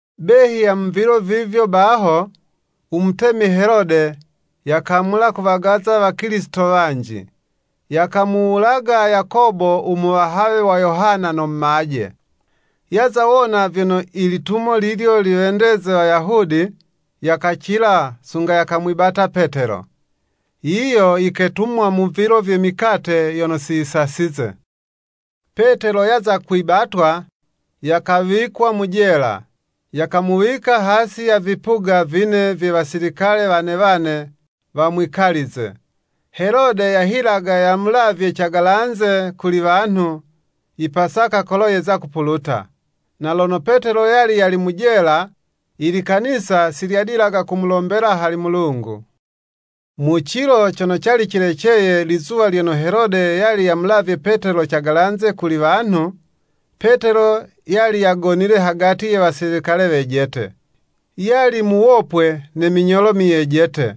Behi ya mu vilo vivyo baho, u mutemi Helode yakamula kuwagaza wakilisito wanji. Yakamuwulaga Yakobo u muwahawe wa Yohana, no mumaje. Yaza wona vyono i litumo lilyo liwendeze Wayahudi, yakacila, sunga yakamwibata Petelo. Yiyo yiketumwa mu vilo vye mikate yono siyisasize. Petelo yaza kwibatwa, yakawikwa mu jela, yakamuwika hasi ya vipuga vine vye wasilikale wane wane wamwikalize. Helode yahilaga yamulavye cagalanze kuli wanhu, i Pasaka kolo yeza kupuluta. Na lono Petelo yali yali mu jela, ilikanisa si lyadilaga kumulombela hali Mulungu. Mu cilo cono cali cileceye lizuwa lyono Helode yali yamulavye Petelo cagalanze kuli wanhu, Petelo yali yagonile hagati ye wasilikale wejete, yali muwopwe ne minyolo myejete,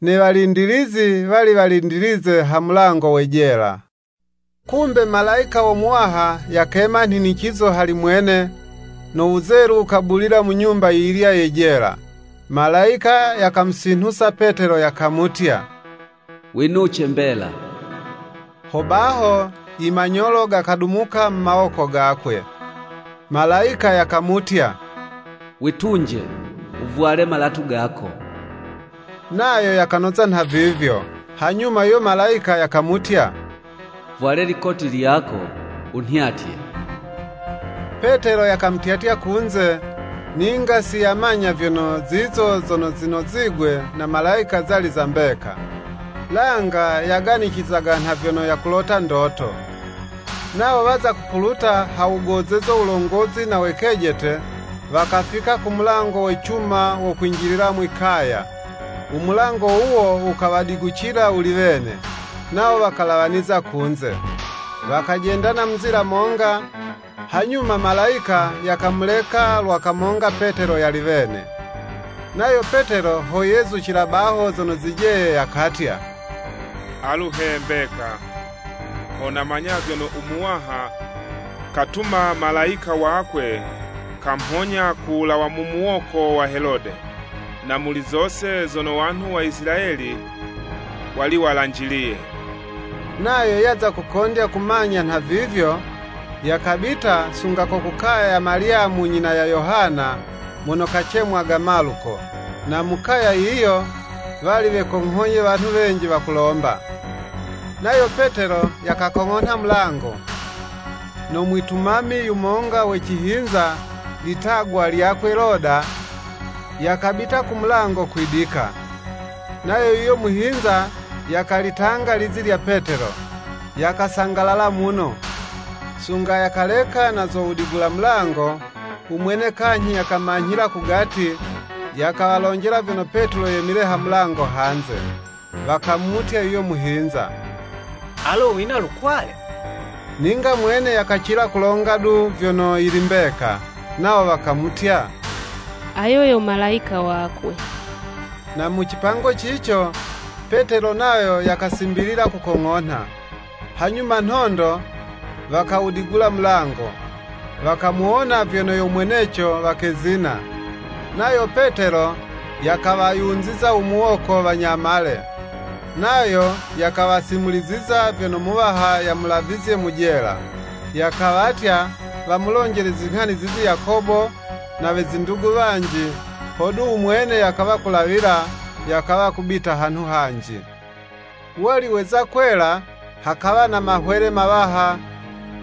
ne walindilizi wali walindilize ha mulango we jela. Kumbe, Malayika wo Muwaha yakema nhinicizo hali mwene, no wuzelu wukabulila mu nyumba yiyilya ye jela. Malayika yakamusinhusa Petelo, yakamutya “Winuce mbela.” Ho baho imanyolo gakadumuka mu mawoko gakwe. Malayika yakamutya, “Witunje, wuvwale malatu gako.” Nayo yakanoza nhavivyo. Hanyuma yuyo Malayika yakamutya, “Vwale likoti lyako, wunhyatye.” Petelo yakamutyatya kunze, ninga si yamanya vyono zizo zono zinozigwe na Malayika zali za mbeka, langa yaganicizaga nha vyono yakulota ndoto. Nawo waza kupuluta ha wugozezo wulongozi na we kejete, wakafika ku mulango wa cuma wo kwinjilila mwi'kaya, u mulango wuwo wukawadigucila wuli wene, nawo wakalawaniza kunze. Wakajendana mu nzila monga, hanyuma Malayika yakamuleka lwa kamonga Petelo yali wene. Nayo Petelo ho yezucila baho zono zijeye, yakatya, “Alu he mbeka, ho namanya vyono u Muwaha katuma Malayika wakwe kamhonya kulawa mu muwoko wa Helode, na muli zose zono wanhu wa Isilayeli wali walanjiliye.” Nayo yaza kukondya kumanya nhavivyo, yakabita sunga ko ku kaya ya Malyamu nyina ya Yohana, mono kacemwaga Maluko. Na mu kaya yiyo, wali wekonghoye wanhu wenji wakulomba. Nayo Petelo yakakong'onha mulango, no mwitumami yumonga we cihinza litagwa lyakwe Loda, yakabita ku mulango kwidika. Nayo yuyo muhinza yakalitanga lizi lya Petelo, yakasangalala muno, sunga yakaleka na zo wudigula mulango, umwene kanyhi yakawamanyhila kugati, yakawalonjela vyono Petelo yemile ha mulango hanze. Wakamutya yuyo muhinza, “Alo wina lukwale!” Ninga mwene yakacila kulonga du, vyono yili mbeka. Nawo wakamutya, “Ayo yo Malayika wakwe.” Na mu cipango cico, Petelo nayo yakasimbilila kukong'onha. Hanyuma nhondo wakawudigula mulango, wakamuwona, vyono yo mweneco, wakezina. Nayo Petelo, yakawayunziza u muwoko, wanyamale, nayo yakawasimuliziza vyono Muwaha yamulavizye mu jela. Yakawatya wamulonjele zinghani zizi Yakobo, na we zindugu wanji, hodu u mwene yakawa kulawila, yakawa kubita hanhu hanji. Wali weza kwela, hakawa na mahwele mawaha,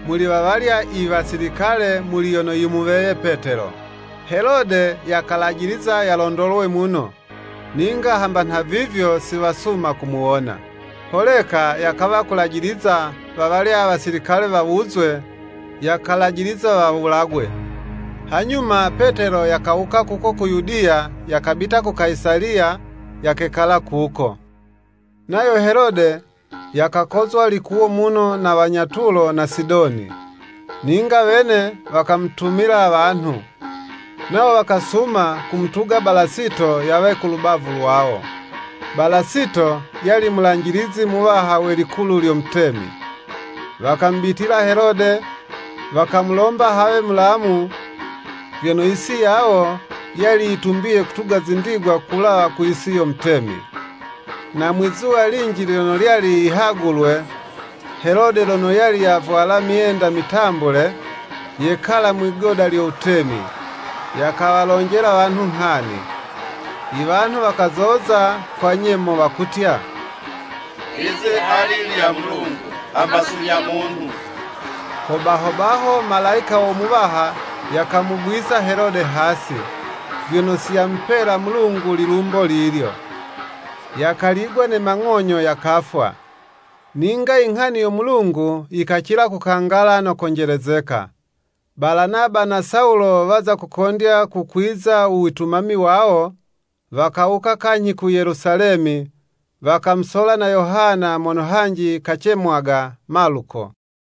muli wawalya iwasilikale muli yono yimuweye Petelo. Helode yakalajiliza yalondolwe muno, ninga hamba nhavivyo si wasuma kumuwona. Holeka yakawa kulajiliza wawalya wasilikale wawuzwe, yakalajiliza wawulagwe. Hanyuma Petelo yakawuka kuko ku Yudiya yakabita ku Kayisaliya, yakekala kuko. Nayo Helode yakakozwa likuwo muno na wanya Tulo na Sidoni. Ninga wene wakamutumila wanhu. Nawo wakasuma kumutuga Balasito yawe ku lubavu lwawo. Balasito yali mulanjilizi muwaha we likulu lyo mutemi. Wakamubitila Helode, wakamulomba hawe mulamu, vyono yisi yawo, yali yitumbiye kutuga zindigwa kulawa ku yisi yo mutemi. Na mwizuwa linji lyono lyali yihagulwe, Helode lono yali yavwala myenda mitambule, yekala mwigoda lyo wutemi, yakawalonjela wanhu nghani. Iwanhu wakazoza kwa nyemo wakutya, “Lizi ali lya Mulungu, hamba si lya munhu.” Ho baho baho Malayika wo Muwaha yakamugwisa Helode hasi, vyono si yamupela Mulungu lilumbo lilyo. Yakaligwa ne mang'onyo, yakafwa. Ninga inghani yo Mulungu yikacila kukangala no konjelezeka. Balanaba na Sawulo waza kukondya kukwiza u witumami wawo, wakawuka kanyhi ku Yelusalemi, wakamusola na Yohana mono hanji kacemwaga Maluko.